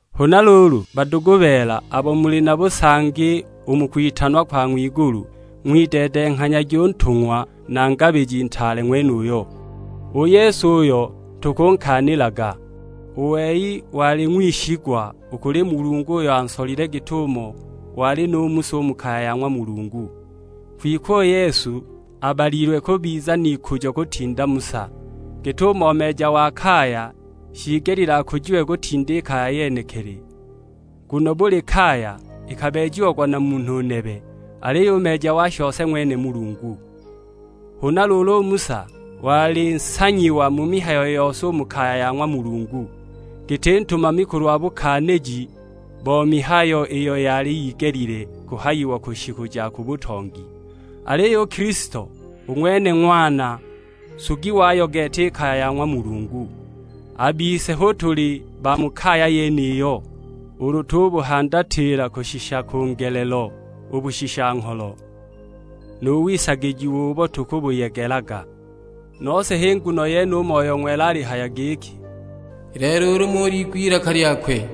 Huna luulu badugu beela, abo muli na busangi u mu kwitanwa kwa ng'wigulu, ng'wideedenghanyagi u Ntung'wa na Ngabiji Ntaale ng'wenuyo; u Yesu uyo tukunkaanilaga. U wei wali ng'wishigwa u kuli Mulungu uyo ansolile, git'umo wali nu Musa u mu kaya ya ng'wa Mulungu. Kwike u Yesu abalilwe kubiza n'ikujo kutinda Musa; git'umo meeja wa kaya shiigelile akujiwe kutinda i kaya yenekili. Nguno buli kaya ikabeejiagwa na munhu nebe, aliyo u meeja wa shose ng'wene Mulungu. Huna luulu u Musa wali nsanyiwa mu mihayo yose u mu kaya ya ng'wa Mulungu, giti ntumami kulwa bukaaniji bo mihayo iyo yali yigelile kuhayiwa ku shiku ja ku butongi. Aliyo u Kilisto u ng'wene Ng'wana, nsugi wayo gete i kaya ya ng'wa Mulungu; a bise hu tuli ba mu kaya yeniyo, ulu tubuhandatila kushisha ku ngelelo u bushisha-ngholo, nu wisagijiwa ubo tukubuyegelaga. Nose h'i nguno yene u Moyo Ng'wela alihaya giki, "I lelo ulu muliigwe ilaka lyakwe,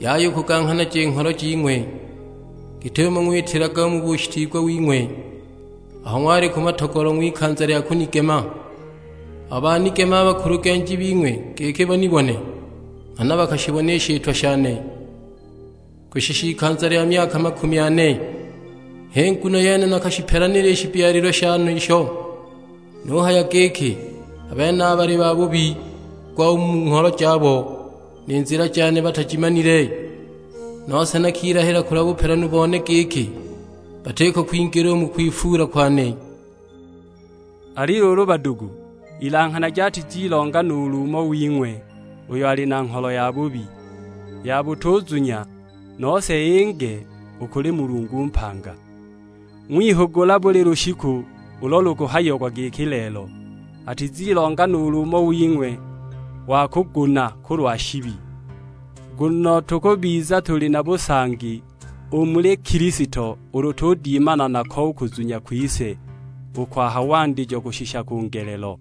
yaya u kuganghanaja i ngholo jing'we; git'umo ng'witilaga mu bushitiigwa wing'we, aho ng'wali ku matogolo ng'wikanza lya kunigema. Aho banigemaga a bakulugenji bing'we giki banibone; nghana bakashibona i shitwa shane, kushisha ikanza lya myaka makumi ane. H'i nguno yene nakashipelanila i shibyalilwe shenisho; nuhaya giki, 'A benaba bali babubi gwa u mu ngholo jabo, ni nzila jane batajimanile!' Nose nakilahila kulwa bupelanu bone giki, 'Batiko kwingila u mu kwifuula kwane!' " Ali luulu badugu, ilanghanagi atizilonga nuulu umo wing'we uyo ali na ngholo yabubi, ya butuzunya, nose inge u kuli Mulungu mpanga. Ng'wihugula buli lushiku ulo lukuhayiagwa giki lelo; atizilonga nuulu umo wing'we wa kuguna kulwa shibi. Nguno tukubiza tuli na busangi u muli Kilisto ulu tudimana nako u kuzunya kwise u kwa ha wandijo kushisha ku ngelelo.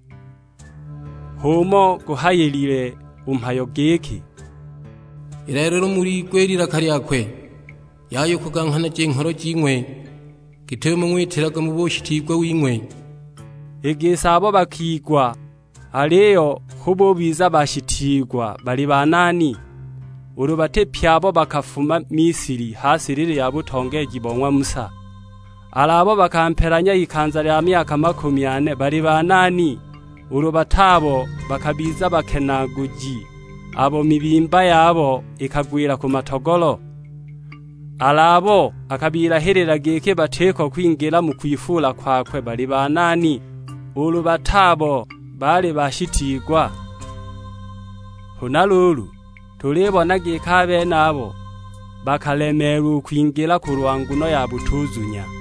H'umo guhayilile u mhayo giki, "I lelo ulu muliigwe ilaka lyakwe, yaya u kuganghanaja i ngholo jing'we, git'umo ng'witilaga mu bushitiigwa wing'we." I gisi abo bakigwa aliyo hu bubiza bashitiigwa baali banani, ulu bati pye abo bakafuma Misili ha silili ya butongeeji bo ng'wa Musa? Al'abo bakampelanya ikanza lya myaka makumi ane baali banani, ulu bat'abo bakabiza bakenaaguji, abo mibimba yabo ikagwila ku matogolo? Al'abo akabilahilila giki batiko kwingila mu kwifuula kwakwe baali banani, ulu bati abo baali bashitiigwa? Huna luulu, tulibona giki a benabo bakalemeelwa u kwingila kulwa nguno ya butuzunya!